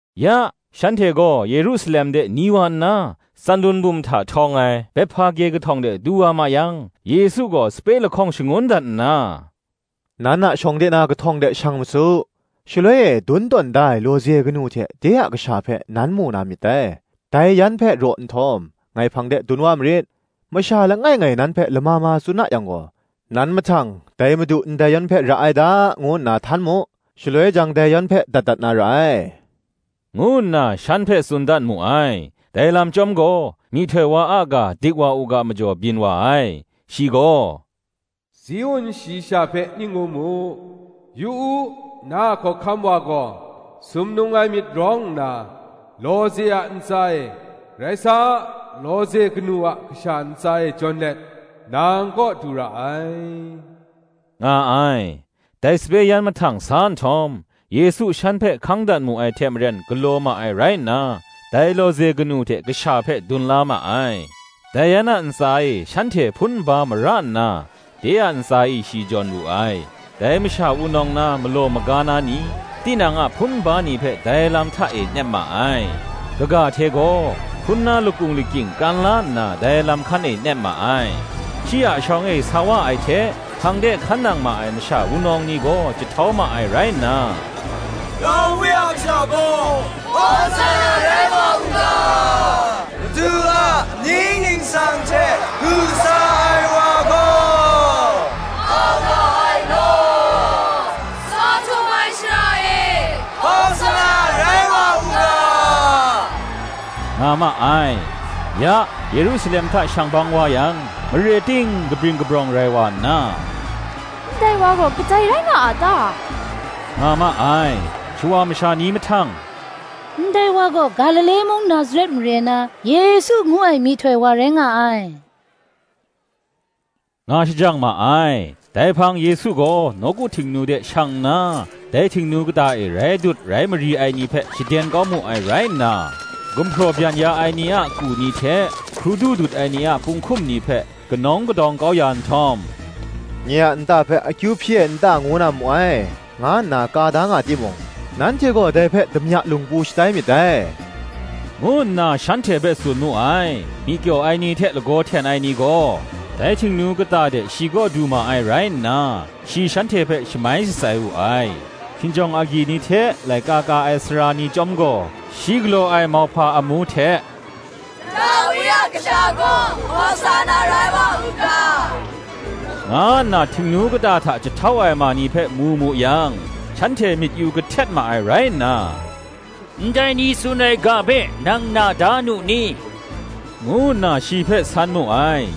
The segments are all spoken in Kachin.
Ya, shanhte gaw Yerusalem de ni wa nna, Tsanlun bum hta htawng ai Bethpage kahtawng de du ma yang Yesu gaw sape lahkawng shangun dat nna, “Nan a shawng de na kahtawng de shang ma su; shaloi e dun tawn da ai lawze kanu hte de a kasha hpe nan mu na myit dai: dai yan hpe raw nhtawm, ngai hpang de dun wa marit. Masha langai ngai nan hpe lama ma tsun a yang gaw, nan mahtang, Dai Madu ndai yan hpe ra ai da, ngu nna htan mu; shaloi jang, dai yan hpe dat dat na ra ai,” ngu nna shan hpe tsun dat mu ai. Dai lam chyawm gaw, myihtoi wa a ga dik wa u ga majaw byin wa ai. Shi gaw, “Ziun shayi sha hpe ning ngu mu: ‘Yu u, na a Hkawhkam wa gaw, Sumnung ai myit rawng nna, lawze a ntsa e, Rai sa, lawze kanu a kasha ntsa e jawn let, nang kaw du ra ai,” nga ai. Dai sape yan mahtang sa nhtawm, Yesu shan hpe hkang dat mu ai hte maren galaw ma ai rai nna, dai lawze kanu hte kasha hpe dun wa ma ai; dai yan a ntsa e shanhte hpun nba mara nna, de a ntsa e shi jawn wu ai. Dai masha wunawng na malaw maga na ni, tinang a hpun nba ni hpe dai lam hta e nep ma ai; kaga hte gaw, hpun na lakung lakying kran la nna, dai lam hkan e nep ma ai. Shi a shawng e sa wa ai hte, hpang de hkan nang ai masha wunawng ni gaw jahtau ma ai rai nna, “Dawi a Kasha kaw, Hawsanna, rai wa u ga; Madu a amying ningsang hte du sa ai wa gaw, a nga ai law! Tsaw Htum ai shara e, Hawsanna, rai wa u ga,” nga ma ai. Ya, Yerusalem hta shang bang wa yang, mare ting kabring kabrawng rai wa nna, “Ndai wa gaw, kadai rai nga a ta?” nga ma ai. Shawa masha ni mahtang, “Ndai wa gaw, Galile mung Nazaret mare na, Yesu ngu ai myihtoi wa rai nga ai,” nga shajang ma ai. Dai hpang Yesu gaw nawku Htingnu de shang nna, dai Htingnu kata e rai dut rai mari ai ni hpe shaden kau mu ai rai nna, gumhpraw byan ya ai ni a ku ni hte, hkrudu dut ai ni a punghkum ni hpe, kanawng kadawng kau ya nhtawm, “Nye a nta hpe akyu hpyi ai nta ngu na mu ai, nga nna ka da nga timung, nanhte gaw dai hpe damya lungpu shatai myit dai,” ngu nna shanhte hpe tsun mu ai. Myi kyaw ai ni hte lagaw hten ai ni gaw, dai Htingnu kata de shi kaw du ma ai rai nna, shi shanhte hpe shamai shatsai wu ai. Hkinjawng agyi ni hte laika ka ai sara ni chyawm gaw, shi galaw ai mauhpa amu hte, “Dawi a Kasha kaw, Hawsanna rai wa u ga,” nga nna Htingnu kata hta jahtau ai ma ni hpe mu mu yang, shanhte myit yu kahtet ma ai rai nna, “Ndai ni tsun ai ga hpe nang na da nu ni?” ngu nna shi hpe san mu ai.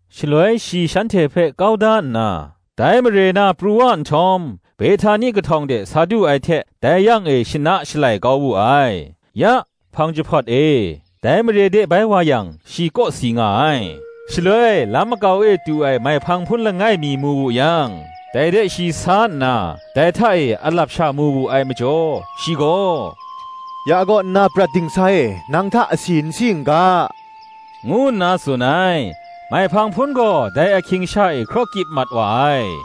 Shaloi shi shanhte hpe kau da nna, dai mare na pru wa nhtawm, Behtani kahtawng de sa du ai hte dai yang e shana shalai kau wu ai. Ya, hpang jahpawt e, dai mare de bai wa yang, shi kawsi nga ai. Shaloi lam makau e tu ai maihpang hpun langai mi mu wu yang, dai de shi sa nna, dai hta e alap sha mu wu ai majaw, shi gaw, “Ya kaw nna prat dingsa e, nang hta asi n si n ga,” ngu nna tsun ai: maihpang hpun gaw dai ahkring sha e hkraw kyip mat wa ai.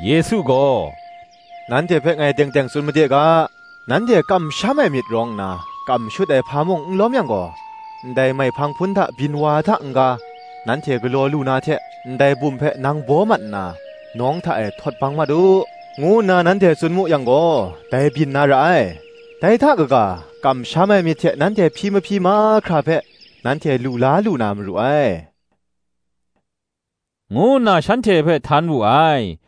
Yesu gaw, “Nanhte hpe ngai teng teng tsun made ga, Nanhte kamsham ai myit rawng nna, kam shut ai hpa mung n lawm yang gaw, ndai maihpang hpun hta byin wa ai hta n-ga, nanhte galaw lu na hte, ndai bum hpe, Nang baw mat nna, nawng hta e htawt bang mat u, ngu nna nanhte tsun mu yang gaw, dai byin na ra ai. Dai hta kaga, kamsham ai myit hte nanhte hpyi mahpyi mahkra hpe, nanhte lu la lu na maru ai,” ngu nna shanhte hpe htan wu ai.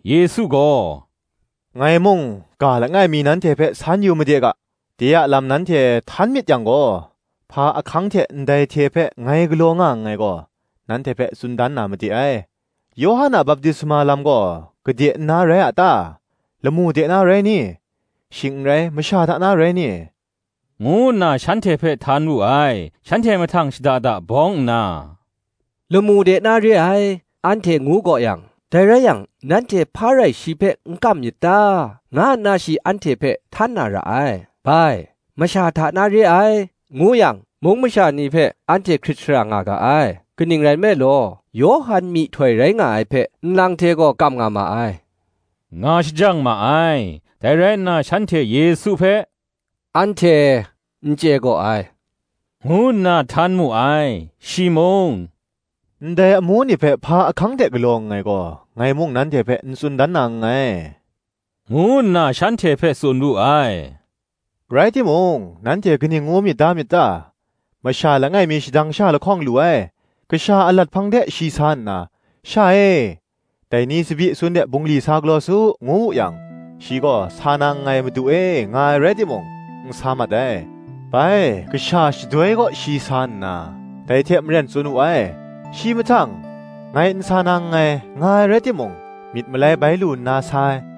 Yesu gaw, “Ngai mung, ga langai mi nanhte hpe san yu made ga; de a lam nanhte htan myit yang gaw, hpa ahkang hte ndai hte hpe ngai galaw nga nngai gaw, nanhte hpe tsun dan na made ai: Yawhan a baptisma lam gaw gade nna rai a ta? lamu de na, rai ni? shing n rai, masha hta na rai ni?” ngu nna shanhte hpe htan wu ai. Shanhte mahtang shada da bawng nna, ‘Lamu de na re ai,’ anhte ngu gaw yang, ‘Dai rai yang nanhte hpa rai shi hpe n kam myit ta?’ nga nna shi anhte hpe htan na ra ai: bai, Masha hta na re ai, ngu yang, mung masha ni hpe anhte hkrit shara nga ga ai; kaning rai nme law, Yawhan myihtoi rai nga ai hpe, nlang hte gaw kam nga ma ai, nga shajang ma ai. Dai rai nna shanhte Yesu hpe, “Anhte n chye gaw ai,” ngu nna htan mu ai. Shi mung, “Ndai amu ni hpe hpa ahkang hte galaw nngai gaw, ngai mung nanhte hpe n tsun dan na nngai,” ngu nna shanhte hpe tsun wu ai. Rai timung, nanhte kaning ngu myit da myit ta? Masha langai mi shadang sha lahkawng lu ai: kasha alat hpang de shi sa nna. “Sha e, dai ni tsabyi sun de bungli sa galaw su,” ngu wu yang, shi gaw, “Sa na nngai, Madu e,” nga ai rai timung, n sa mat ai. Bai, kasha shadoi kaw shi sa nna, dai hte maren tsun wu ai. Shi mahtang, “Ngai n sa na nngai,” nga ai rai timung, myit malai bai lu nna sa ai.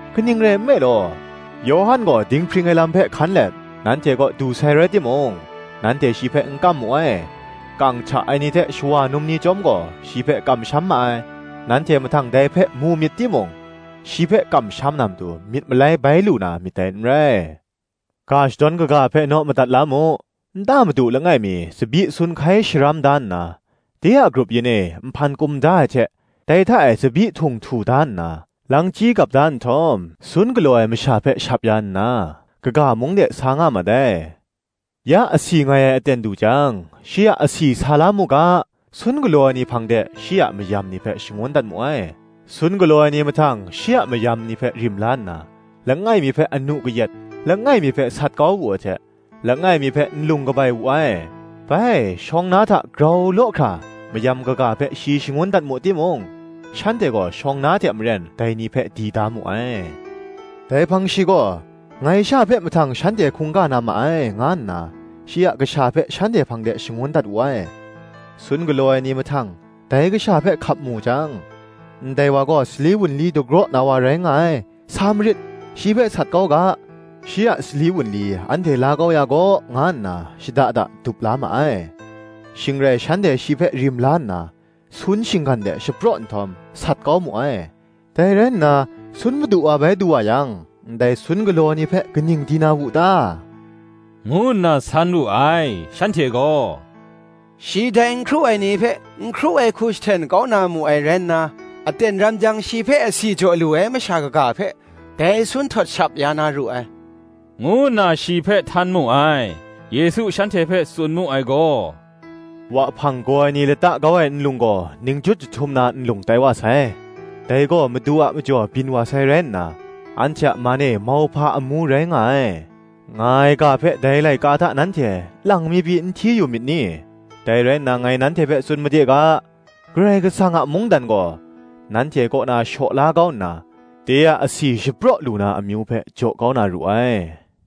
Kaning rai nme law, Yawhan gaw dinghpring ai lam hpe hkan let, nanhte kaw du sai rai timung, nanhte shi hpe n kam mu ai; kang hta ai ni hte shawa num ni chyawm gaw, shi hpe kamsham ma ai: nanhte mahtang dai hpe mu myit timung, shi hpe kamsham na matu, myit malai bai lu na myit dai n rai. Ga shadawn kaga hpe naw madat la mu; Nta madu langai mi tsabyi sun hkai sharam da nna, de a grup yin e nhpan kum da ai hte, dai hta e tsabyi htung htu da nna, langchyi gap da nhtawm, sun galaw ai masha hpe shap ya nna, kaga mung de sa nga mat ai. Ya, asi ngai ai aten du jang, shi a asi sa la mu ga, sun galaw ai ni hpang de, shi a mayam ni hpe shangun dat mu ai. Sun galaw ai ni mahtang shi a mayam ni hpe rim la nna, langai mi hpe anu kayat, langai mi hpe sat kau wu ai hte, langai mi hpe nlung kabai wu ai. Bai, shawng na hta grau law hkra mayam kaga hpe shi shangun dat mu timung, shanhte gaw shawng na hte maren dai ni hpe di da mu ai. Dai hpang shi gaw, Ngai sha hpe mahtang shanhte hkungga na ma ai, nga nna shi a kasha hpe shanhte hpang de shangun dat wu ai. Sun galaw ai ni mahtang dai kasha hpe hkap mu jang, “Ndai wa gaw, sali wunli dagraw na wa rai nga ai; sa marit, shi hpe sat kau ga, shi a sali wunli anhte la kau ya gaw, nga nna shada da dup la ma ai: shing rai shanhte shi hpe rim la nna, sun shinggan de shapraw nhtawm, sat kau mu ai. Dai rai nna, sun madu wa bai du wa yang, ndai sun galaw ai ni hpe, kaning di na wu ta?” ngu nna san wu ai. Shanhte gaw, “Shi dai nkru ai ni hpe, n hkru ai hku jahten kau na mu ai rai nna, aten ram jang shi hpe asi jaw lu ai masha kaga hpe, dai sun htawt shap ya na ru ai,” ngu nna shi hpe htan mu ai. Yesu shanhte hpe tsun mu ai gaw, “Wahpang gaw ai ni lata kau ai nlung gaw, Ningjut jahtum na nlung tai wa sai: Dai gaw, Madu a majaw byin wa sai rai nna, Anhte a man e mauhpa amu rai nga ai,” nga ai ga hpe, dai laika hta nanhte lang mi pyi n hti yu myit ni? Dai rai nna, ngai nanhte hpe tsun made ga, Karai Kasang a mungdan gaw, nanhte kaw na shaw la kau nna, de a asi shapraw lu na amyu hpe jaw kau na ru ai.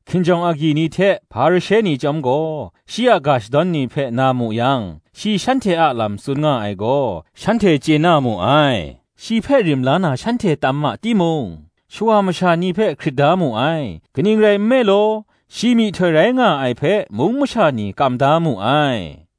Hkinjawng agyi ni hte Hparishe ni chyawm gaw, shi a ga shadawn ni hpe na mu yang, shi shanhte a lam tsun nga ai gaw, shanhte chye na mu ai. Shi hpe rim la na shanhte tam ma timung, shawa masha ni hpe hkrit da mu ai: kaning rai nme law, shi myihtoi rai nga ai hpe mung masha ni kam da mu ai.